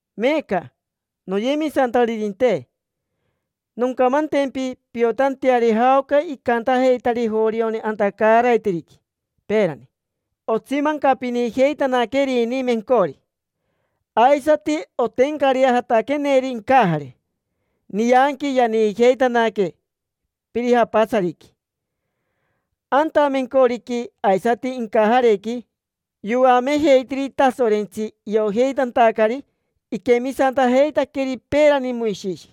Meeca, noyemisantaririnte, noncamantempi piotanteari jaoca icantajeitari jorioni anta caaraiteriqui, peerani. Otsimancapinijeitanaquerini mencori; aisati otencareajataqueneri incajare, nianqui yaniijeitanaque pirijapatsariqui. Anta mencoriqui aisati incajarequi yoamejeitiri Tasorentsi iojeitantacari iquemisantajeitaqueri peerani Moishishi.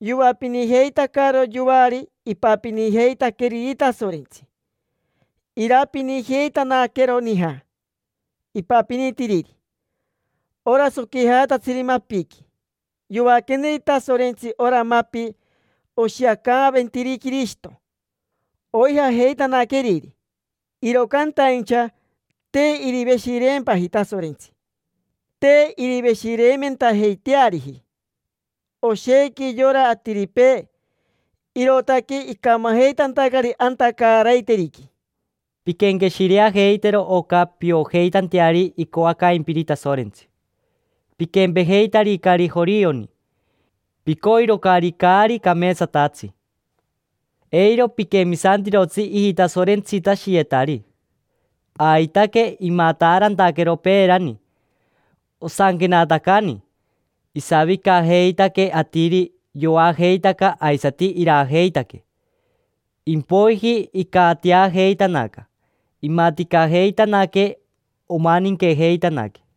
Yoapinijeitacaro yoari ipapinijeitaqueriri Tasorentsi. Irapinijeitanaquero nija ipapinitiriri, ora soquijatatsiri mapiqui. Yoaqueneri Tasorentsi ora mapi, oshiacaaventiri Quirishito, oijajeitanaqueriri. Iro cantaincha te iriveshireempaji Tasorentsi. Te iriveshireimentajeiteariji oshequi yora atiripee, irootaque icamajeitantacari anta caaraiteriqui. Pinquenqueshireajeitero oca piojeitanteari icoacaimpiri Tasorentsi. Piquempejeitaricari jorioni: picoirocari caari cameetsatatsi. Eiro piquemisantirotsi ijitasorentsitashiyetari. Aitaque imataarantaquero peerani. Osanquenatacani: “Isavicajeitaque atiri, yoajeitaca aisati iraajeitaque. Impoiji icatiajeitanaca, imaticajeitanaque, omaninquejeitanaque”.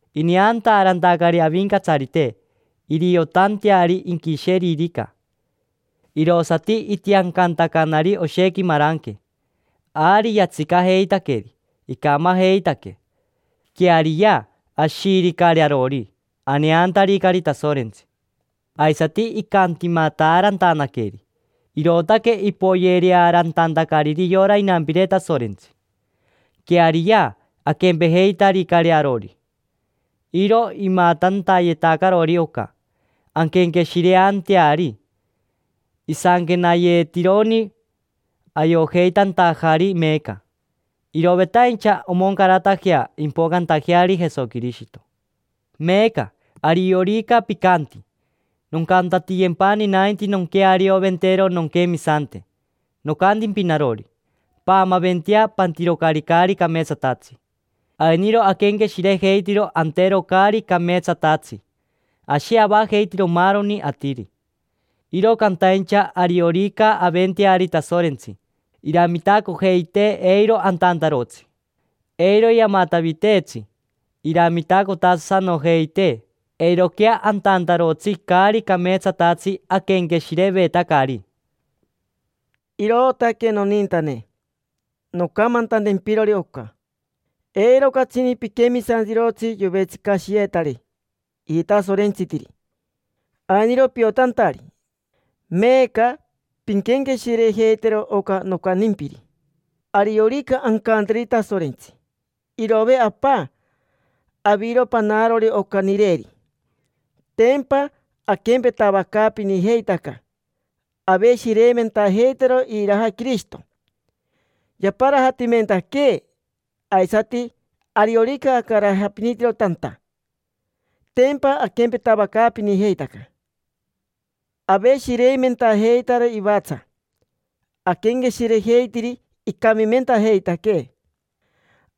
Ineantaarantacari Avincatsarite, iriotanteari inquisheririca, irosati itiancantacanari oshequi maranque. Ari yatsicajeitaqueri, icamajeitaque. Queariya, ashiiricari arori, aneantaricari Tasorentsi. Aisati icantimataarantanaqueri, irootaque ipoyerearantantacariri yora inampire Tasorentsi. Queariya, aquempejeitaricari arori. Iro imatantayetacarori oca, anquenqueshireanteari. Isanquenayeetironi, ayojeitantajari meeca. Irovetaincha omoncaratajea impocantajeari Jesoquirishito. Meeca, ariorica picanti: “Noncantatiyempani nainti nonquearioventero nonquemisante”, nocantimpi narori: “Paamaventea, pantirocari caari cameetsatatsi”. Ainiro aquenqueshirejeitiro antero caari cameetsatatsi: ashi avajeitiro maaroni atiri. Iro cantaincha ariorica aventeari Tasorentsi, iramitacojeitee eiro antantarotsi. Eiro yamataviteetsi, iramitacotasanojeitee eiroquea antantarotsi caari cameetsatatsi aquenqueshirevetacari. Irootaque, nonintane, noncamantantempirori oca: “Eiro catsini piquemisantirotsi yovetsicashiyeetari ijitasorentsitiri”. Ainiro piotantari, meeca pinquenqueshirejeitero oca nocantimpiri. Ariorica ancanteri Tasorentsi: “Irove, Apa, aviro panarori oca nireri”, tempa aquempetavacaapinijeitaca, aveshireimentajeitaro iriraja Quirishito yaparajatimentaquee. Aisati, ariorica acarajapinitiro tanta, tempa aquempetavacaapinijeitaca, aveshireimentajeitaro ivatsa, aquenqueshirejeitiri icamimentajeitaquee.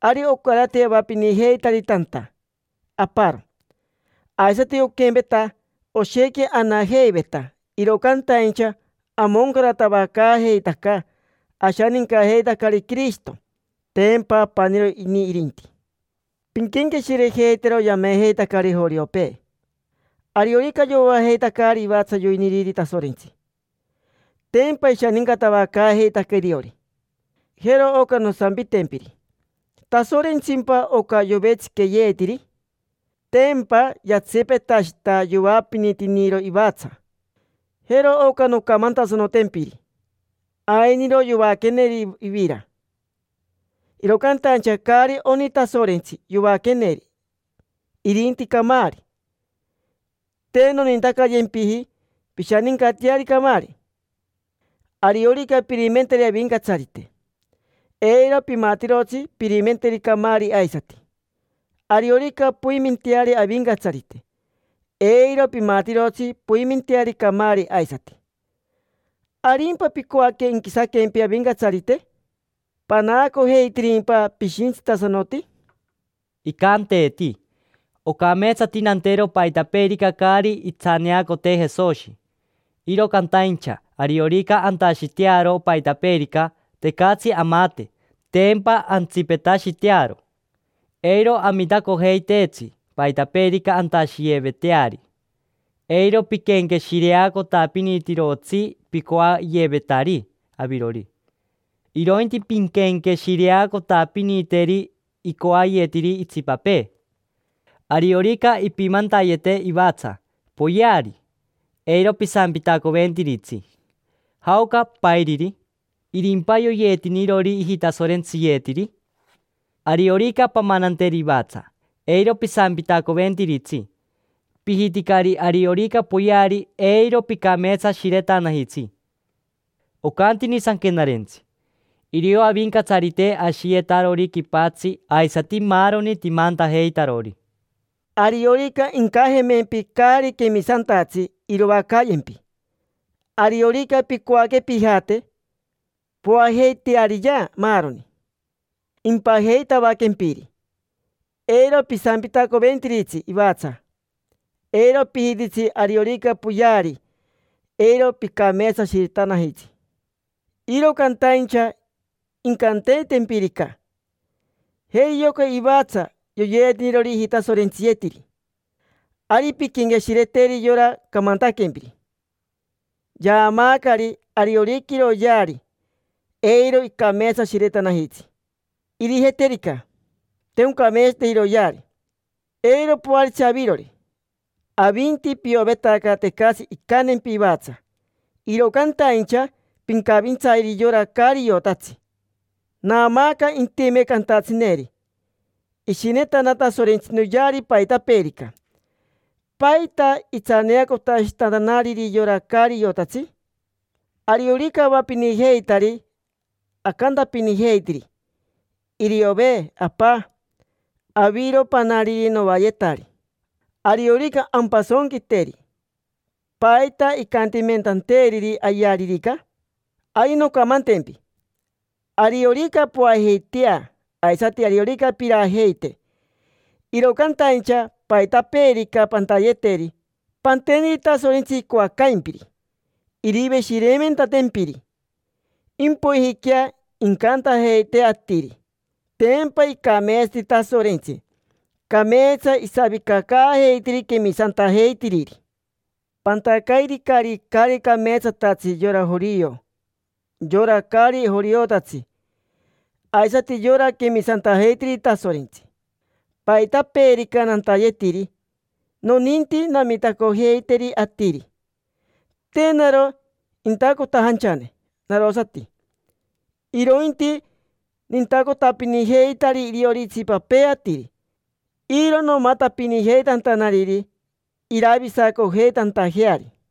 Ari ocarati avapinijeitari tanta aparo. Aisati oquempeveta, oshequi anajeiveta, iro cantaincha amoncaratavacaajeitaca, ashanincajeitacari Quirishito: tempa apaniro ini irinti. Pinquenqueshirejeitero yamejeitacari joriopee. Ariorica yoajeitacari ivatsa yoiniriri Tasorentsi, tempa ishanincatavacaajeitaca iriori. Jero oca nosampitempiri: ¿Tasorentsimpa oca yovetsiqueeyetiri? Tempa yatsipetashita yoapinitiniro ivatsa. Jero oca noncamantasanotempiri. Ainiro yoaqueneri ivira. Iro cantaincha caari oni Tasorentsi yoaqueneri, irinti camaari. Te nonintacayempiji pishanincateari camaari. Ariorica pirimenteri Avincatsarite, eiro pimatirotsi pirimenteri camaari aisati. Ariorica poimenteari Avincatsarite, eiro pimatirotsi poimenteari camaari aisati. ¿Arimpa picoaque inquisaquempi Avincatsarite? ¿Panaacojeitirimpa pishintsitasanoti? Icanteeti: “Ocameetsati nantero paitapeerica caari itsaneacotee Jesoshi”, iro cantaincha ariorica antashitearo paitapeerica, tecatsi amate, tempa antsipetashitearo. Eiro amitacojeiteetsi paitapeerica antashiyeveteari. Eiro piquenqueshireacotapinitirotsi picoayevetari avirori, irointi pinquenqueshireacotapiniteri icoayetiri itsipapee. Ariorica ipimantayeti ivatsa, poyeari. Eiro pisampitacoventiritsi: “¿Jaoca pairiri? ¿Irimpa yoyeetinirori ijitasorentsiyeetiri?” Ariorica pamananteri ivatsa, eiro pisampitacoventiritsi, pijiticari ariorica poyeari eiro picameetsashiretanajitsi. Ocantini Sanquenarentsi: “Irio Avincatsarite ashiyetarori quipatsi aisati maaroni timantajeitarori”. Ariorica incajemempi caari quemisantatsi iroacayempi. Ariorica picoaque pijate, poajeiteariyea maaroni impajeitavaquempiri. Eiro pisampitacoventiritsi ivatsa, eiro pijititsi ariorica poyeari, eiro picameetsashiretanajitsi. Iro cantaincha incanteetempirica: “Jeri yoca ivatsa, yoyeetinirori ijitasorentsiyeetiri”. Ari pinquenqueshireteri yora camantaquempiri: yaamaacari ariorica iroyeari, eiro icameetsashiretanajitsi. Irijiterica te oncameetsateji iroyeari, eiro poaritsi avirori. Avinti piovetaca tecatsi incantempi ivatsa, iro cantaincha pincavintsayeri yora caari iotatsi. Naamaaca intime cantatsineri: “Ishinetana Tasorentsi noyeari paitapeerica, ¿paita itsaneacotashitantanariri yora caari iotatsi? Ariorica avapinijeitari, acantapinijeitiri: ‘Iriove, Apa, aviro panariri noayetari’. Ariorica ampasonquiteri, ¿paita icantimentanteeriri ayearirica?” Ari noncamantempi. Ariorica poajeitea, aisati ariorica pirajeite; iro cantaincha paitapeerica pantayeteri, panteneri Tasorentsi icoacaimpiri, iriveshireimentantempiri. Impoijiquea incantajeite atiri: “Tempa icameetsati Tasorentsi. Cameetsa isavicacaajeitiri quemisantajeitiriri”. Pantacairicari caari cameetsatatsi yora jorio, yora caari joriotatsi, aisati yora quemisantajeitiriri Tasorentsi. Paitapeerica nantayetiri, noninti namitacojeiteri atiri. Te naro intacotajanchane narosati, irointi nintacotapinijeitari iriori itsipapee atiri. Iro nomatapinijeitantanariri iravisacojeitantajeari.